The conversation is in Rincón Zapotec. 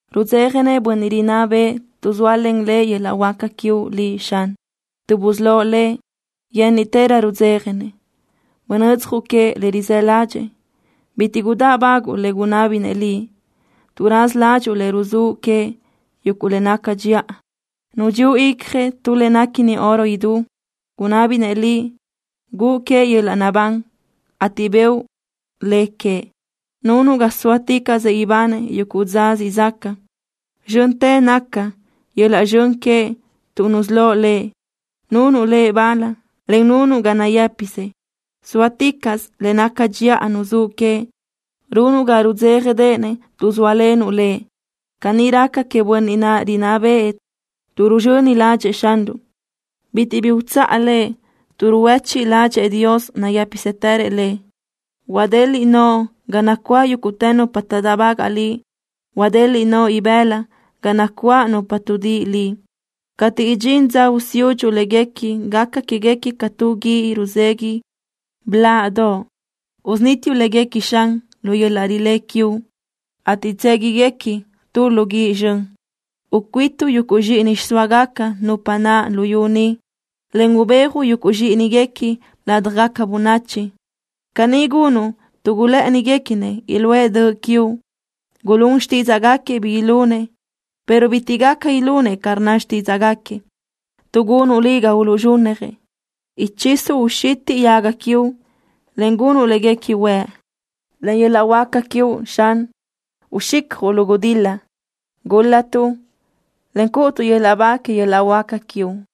Rudzéjanëʼ bönniʼ rinná bëʼë tuʼ zóalen lëʼ yöl-laʼ huáca quiuʼ Liʼ, Xan. Tuʼ busölóʼ lëʼ, yénniʼtërö rudzéjanëʼ. Bunödzjuʼ queëʼ le rizë́ ládxëʼë. Bitiʼ gudáʼbaguʼu le gunábinëʼ Liʼ. Tuʼ raza ládxuʼu lëʼ ruzúʼ queëʼ yuguʼ le naca dxiʼa. Nudxíuʼ icjëʼ tu le néquini oro idú. Gunábinëʼ Liʼ guʼu queëʼ yöl-laʼ naʼbán, ateʼ bëʼu le queëʼ. Nunuʼ ga sóaticaʼsëʼ ibanëʼ yuguʼ dza siʼ zaca. Zxöntë naca yöl-laʼ zxön queëʼ tuʼ nusölóʼ lëʼ. Nunuʼ lëʼ bal, en nunuʼ ga nayë́pisëʼ. Zóaticaʼsö le naca dxiʼa nuzúʼ queëʼ. Runuʼ ga rudzéjadeʼenëʼ tuʼ zóalenuʼ lëʼ. Caní raca queëʼ bönniʼ naʼ rinná bëʼë tuʼ ruzxöni ládxëʼë Xanruʼ. Bitiʼ bi utsáʼ lëʼ tuʼ ruhuéchiʼ ládxëʼë Dios nayë́pisëtërëʼ lëʼ. Huadeliʼ noʼo ga nacuáʼ yúguʼtë nupa taʼdáʼbagaʼ Liʼ. Huadeliʼ noʼo ibëla ga nacuáʼ nupa tuʼdíʼi Liʼ. Cateʼ idxín dza usiúdxuʼ léguequi gaca quéguequi ca tu guíʼ ruzegui blaʼdoʼ. Usunítiuʼ léguequi, Xan, lu yöl-laʼ rilé quiuʼ, ateʼ tséguiguequi tu lu guíʼ zxön. Ucuítuʼ yuguʼ zxíʼini xiʼsóagaca nupa naʼ luyú ni, en ubéajuʼ yuguʼ zxíʼiniguequi ládjagaca bönachi. Caní gunuʼ tuʼ gulë́ʼëniguequinëʼ iluʼë döʼ quiuʼ. Gulún xtídzaʼgaquiëʼ bi ilunëʼ, pero bitiʼ gaca ilunëʼ ca rnna xtídzaʼgaquiëʼ, tuʼ gunuʼ Liʼ ga uluʼzxúnnajëʼ. Ichisuʼ uxitiʼ yaga quiuʼ, en gunuʼ léguequi huëʼ. Len yöl-laʼ huáca quiuʼ, Xan, uxicjuʼ lu gudil-la. Gúl-latuʼ, en cúʼutuʼ yöl-laʼ ba que yöl-laʼ huáca quiuʼ.